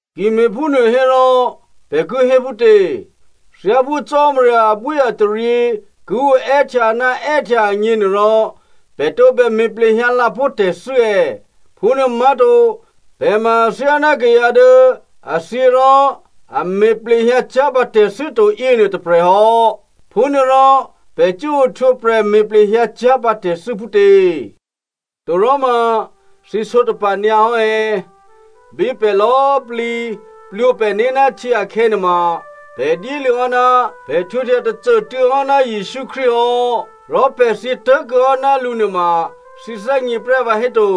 Ki me̤phúnuô hérò, pè̤ ki hé phútě? Thyáphú Cò́marya abwíataryě ki oè́htya ná è́htya agněnuôrò, pè̤ tǒbè me̤ plehyǎ lǎpó̤ tè̤thû́ è̌? Phúnuô má̤to. Pè̤ ma athyáná kayǎ dố a thyě rò a me̤ plehyǎ cyá̤pǎ tè̤thû́ to yěnuô tôprè̤ hò́. Phúnuôrò pè̤ cuố ohtwǒprè̤ me̤ plehyǎ cyá̤pǎ tè̤thû́ phútě? Toròma, thǐ sǒtapa̤ nyǎ hò́ è̌? Bí pè̤ lò̌꤮ plǐ plwǒ pè̤né̤ ná htyě akhè̌ nuôma pè̤ dyéluô̌ hò́ ná pè̤ htwǒhtya tôcô꤮ tuô̌ hò́ ná Jesǔ Krístu hò́, rò pè̤ thyě tố̤kuô̌ hò́ ná lǔ nuôma thǐ thè́gně prè́ vǎhéto?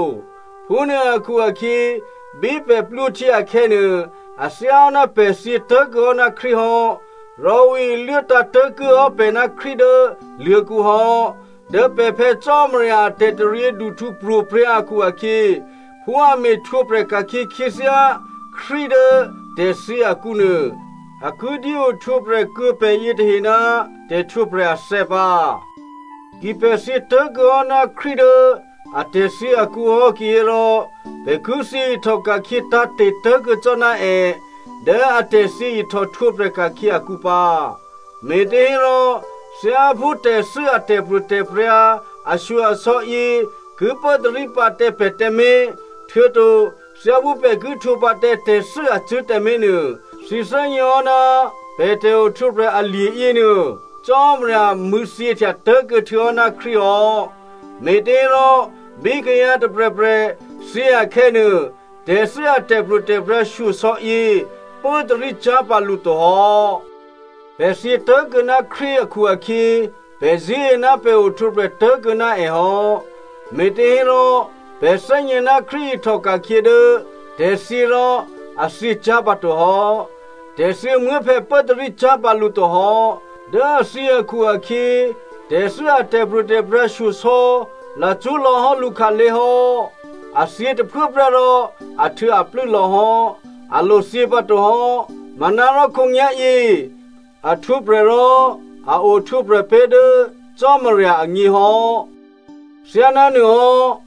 Phúnuô akhu-akhyě bí pè̤ plwǒhtyě akhè̌nuô, a thyáhò́ ná pè̤ thyě tố̤kuô̌ hò́ ná Krístu hò́, rò ǔ iluố tǎ̤tố̤kuô̌ hò́ pè̤ ná Krístu dố luô̤̌kǔ hò́. Dố pè̤ Phè̌ Cò́marya a tè̤taryěduhtǔ pro̤prya̤ akhu-akhyě, phú a me̤htwǒprè̤ ka̤khyě khyěthyá Krístu dố tè̤thyě akǔnuô, a ki dyé ohtwǒprè̤ kuô̌ pè̤ yětahe ná tè̤htwǒprè̤ athè̌ pǎ. Ki pè̤ thyě tố̤kuô̌ hò́ ná Krístu dố atè̤thyě akǔhò́ kihérò pè̤ ki thyě ihtòka̤khyě tǎ̤te̤ tố̤kuô̌ cò́ ná è dố atè̤thyě ihtòhtwǒprè̤ ka̤khyě akǔ pǎ. Me̤těhérò, thyáphú tè̤thû́ a tè̤pro̤tè̤prya̤ ashyo-asò̌ yě ki pốtarí pǎ tǎ pè̤ tǎmé̤, htuô̌to thyáphú pè̤ ki htwǒ pǎ tǎ tè̤thû́ acṳ̂́ tǎmé̤nuô, thǐ thè́gněhò́ ná pè̤ tè̤ohtwǒprè̤ alye̤ yěnuô, Cò́marya mṳ̂̌thyěhtya tố̤kuô̌ htuô̌hò́ ná Krístu hò́. Me̤těhérò, bí kayǎ tôprè̤prè̤ thyě akhè̌nuô, tè̤thû́ a tè̤pro̤tè̤prya̤ shyosò̌yě pốtarí cyá̤pǎ lǔ to hò́. Pè̤ thyě tố̤kuô̌ ná Krístu akhu-akhyě, pè̤ zṳ̂́e ná pè̤ ohtwǒprè̤ tố̤kuô̌ ná è hò́. Me̤těhérò pè̤ thè́gně ná Krístu ihtòka̤khyě dố tè̤thyě rò a thyěcyá̤ pǎtohò́. Tè̤thyěmuố̤phè̌ pốtarí cyá̤pǎ lǔ to hò́. Dố a thyě akhu-akhyě, tè̤thû́ a tè̤pro̤tè̤prya̤ shyosò̌ lacṳ́ lò̌hò́ lǔkhǎlé̤ hò́. A thyě tôphuốprè́ rò ahtuô̌aplû́ lò̌hò́, a lothyě pǎtohò́. Manárò khǒnyá̤yě a htwǒprè̤ rò a ohtwǒprè̤ pé̤ dố Cò́marya agně hò́. Thyánánuôhò́,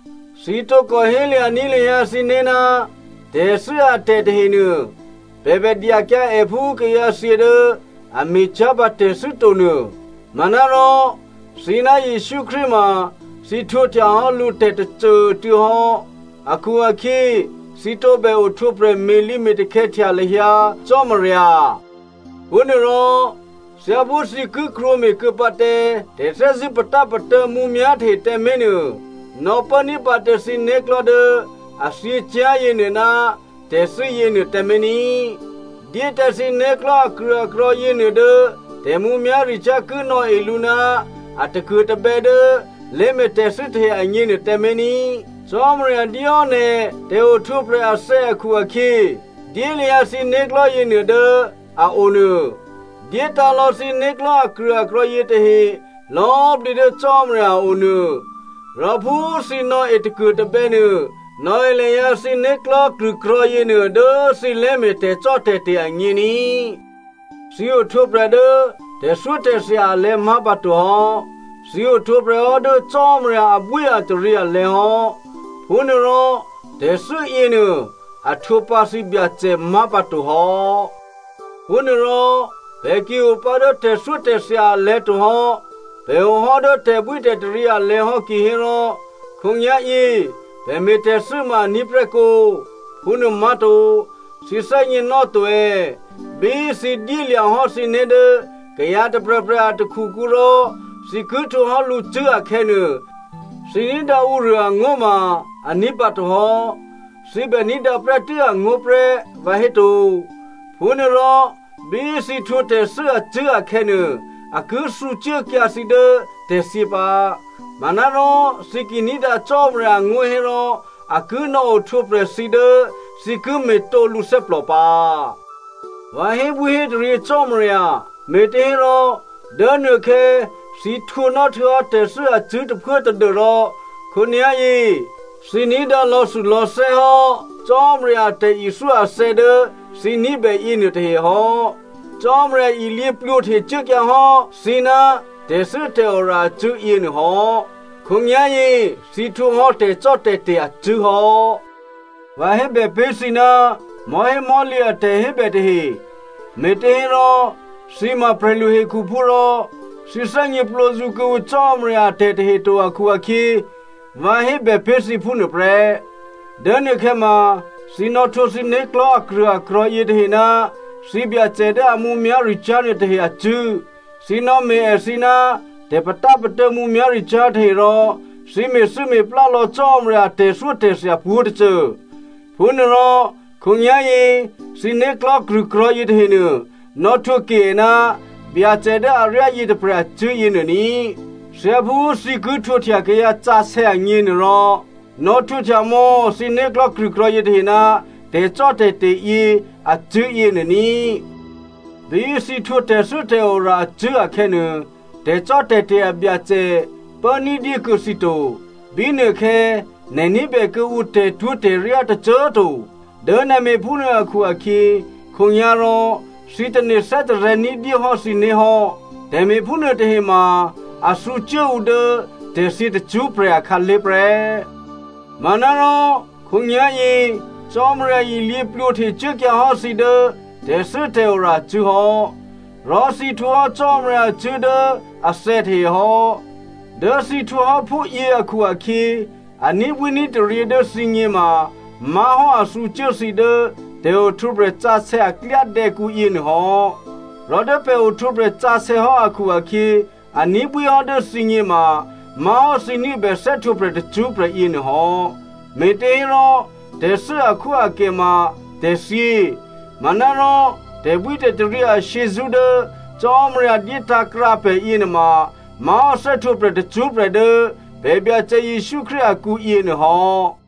thǐ tǒkò hélya̤ní̤ lahyǎ thǐné̤, tè̤thû́ atè̤ tahenuô, pè̤ bèdyakyǎ è phú kayǎthyě dố a me̤cyá̤pǎ tè̤thû́ to nuô. Manárò thǐ ná Jesǔ Krístu ma thǐ htwǒhtyahò́ lǔ tè̤ tôcô꤮ tuô̌ hò́ akhu-akhyě thǐ tǒbè ohtwǒprè̤ me̤lǐ me̤takhè̌htya lahyǎ Cò́marya. Phúnuôrò, thyáphú thǐ ki krwǒme̤ kuô̌ pǎ tǎ tè̤thè́zṳ̂́ patápatô̌ mǔmyá̤ tahe tǎmé̤nuô, nò̌pốní̤ pǎ tǎ thǐ né̤klò̤́ dố a thyěcyá̤ yěnuô ná tè̤thû́ yěnuô tǎmé̤ ní꤮. Dyé tǎ thǐ né̤klò̤́ akrṳ̂akrò̤̌ yěnuô dố tè̤mǔmyá̤ricyá̤ ki nò̌e lǔ ná a takuô̤tabè̌ dố lé̤me̤ tè̤thû́ tahe agněnuô tǎmé̤ ní꤮. Cò́marya dyéhò́ nè̤ tè̤ohtwǒprè̤ athè̌ akhu-akhyě, dyé lahyǎ thǐ né̤klò̤́ yěnuô dố a o nuô. Dyétǎ̤ lò̌ thǐ né̤klò̤́ akrṳ̂akrò̤̌ yětahe lò̌꤮ plǐ dố Cò́marya a o nuô, rò phú thǐ nò̌e takuô̤tabè̌ nuô, nò̌e lahyǎ thǐ né̤klò̤́ krṳ̂krò̤̌ yěnuô dố thǐ lé̤me̤ tè̤cò́tè̤te̤ agně ní꤮. Thǐ ohtwǒprè̤ dố tè̤thyótè̤thya alè̤̌ má̤ pǎtohò́, thǐ ohtwǒprè̤ hò́ dố Cò́marya abwíataryě alè̤̌ hò́. Phúnuôrò tè̤thû́ yěnuô a htwǒ pǎ thǐbyacè má̤pǎtohò́. Phúnuôrò pè̤ ki opǎ dố tè̤thyótè̤thya alè̤̌ to hò́, pè̤ ohò́ dố tè̤bwítè̤taryě alè̤̌ hò́ kihérò, khǒnyá̤yě pè̤ me̤tè̤thû́ ma aní̤ prè́ kǒ? Phúnuô má̤to. Thǐ thè́gněnò́to è̌? Bí thǐ dyélya̤ hò́ thǐné̤ dố kayǎ tôprè̤prè̤ a takhukǔ rò thǐ ki htwǒ hò́ lǔcṳ̂́ akhè̌nuô, thǐ ní̤dǎ ǔruô angó̤ ma a ní̤pǎto hò́. Thǐ bè ní̤dǎ prè́tû́ angó̤ prè́, vǎhéto? Phúnuôrò bí thǐ htwǒ tè̤thû́ acṳ̂́ akhè̌nuô, a ki thǔcuốkyǎ thǐ dố tè̤thyě pǎ. Manárò thǐ ki ní̤dǎ Cò́marya angó̤ hérò a ki nò̌ohtwǒprè̤ thǐ dố thǐ ki me̤tǒ lǔ thè́plò pǎ. Vǎ hébwíhétaryě Cò́marya, me̤těhérò, dố nuôkhè̌ thǐ htwǒnò́ htuô̌hò́ tè̤thû́ acṳ̂́ tôphuố tadû́rò khǒnyá̤yě thǐ ní̤dǎ lò̌thulò̌thè́ hò́ Cò́marya a tè̤ithyó athè̌ dố thǐ ní̤bè yěnuôtahe hò́. Cò́marya ilyě plwǒhtecuốkyǎ hò́ thǐ ná tè̤thû́tè̤ora acṳ̂́ yěnuô hò́. Khǒnyá̤yě thǐ htwǒhò́ tè̤cò́tè̤te̤ acṳ̂́hò́. Vǎ hébè pé̤ thǐ ná mò̤́hémò̤́lǐ a tè̤hébè tahe, me̤těhérò thǐ ma prè̤lu hekhuphú rò, thǐ thè́gněplǒzǔ kuô̌ǔ Cò́marya a tè̤tahe to akhu-akhyě, vǎ hébè pé̤ thǐ phúnuô prè́. Dố nuôkhè̌ ma thǐ nò̌htwǒ thǐ né̤klò̤́ akrṳ̂akrò̤̌ yětahe ná thǐbyacè dố a mǔmyá̤ricyá̤ nuôtahe acṳ̂́, thǐ nò̌me̤ èthǐ ná tè̤patápatô̌ mǔmyá̤ricyá̤ tahe rò thǐ me̤thû́me̤plá lò̌ Cò́marya a tè̤thyótè̤thya pwǒ̤tôcô. Phúnuôrò khǒnyá̤yě thǐ né̤klò̤́ krṳ̂krò̤̌ yětahenuô nò̌htwǒ ke è ná Byacè dố aryá yětôprè̤ acṳ̂́ yěnuô ní꤮. Thyáphú thǐ ki htwǒhtya kayǎsǎsè̌ agněnuôrò, nò̌htwǒhtya mò̌ thǐ né̤klò̤́ krṳ̂krò̤̌ yětahe ná tè̤cò́tè̤te̤ yě acṳ̂́ yěnuô ní꤮. Bí thǐ htwǒ tè̤thû́tè̤ora acṳ̂́ akhè̌nuô, tè̤cò́tè̤te̤ abyacè pố ní̤dyé kuô̌ thǐ to. Bínuôkhè̌ nè̤ ní̤bè kuô̌ǔ tè̤twó̤tè̤ryá tôcô꤮ to. Dố nè̤ me̤ phúnuô akhu-akhyě, khǒnyá̤rò thǐ tane̤ thè́tarè̤̌ ní̤dyé hò́ thǐné̤ hò́. Tè̤me̤ phúnuôtahe ma a thǔcuố ǔ dố tè̤thyě tacṳ́prè̤ akhǎlé̤ prè́. Manárò khǒnyá̤yě Cò́marya ilyě plwǒhtecuốkyǎ hò́ thǐ dố tè̤thû́tè̤ora acṳ̂́ hò́. Rò thǐ htwǒhò́ Cò́marya acṳ̂́ dố athè̌ tahe hò́. Dố thǐ htwǒhò́ phúyě akhu-akhyě, a ní̤bwíní̤taryě dố thǐgně ma má̤hò́ a thǔcuố thǐ dố tè̤ohtwǒprè̤ sǎsè̌ a klyádè̌kǔ yěnuô hò́. Rò dố pè̤ ohtwǒprè̤ sǎsè̌ hò́ akhu-akhyě, a ní̤bwí hò́ dố thǐgně ma má̤hò́ thǐ ní̤bè thè́htwǒprè̤ tacṳ́prè̤ yěnuô hò́. Me̤těhérò, tè̤thû́ akhwóakè ma tè̤thyě. Manárò tè̤bwítè̤taryě ashyězṳ́ dố Cò́marya dyétǎ̤krǎ pè̤ yěnuôma má̤hò́ thè́htwǒprè̤ tacṳ́prè̤ dố pè̤ Byacè Jesǔ Krístu akǔ yěnuôhò́.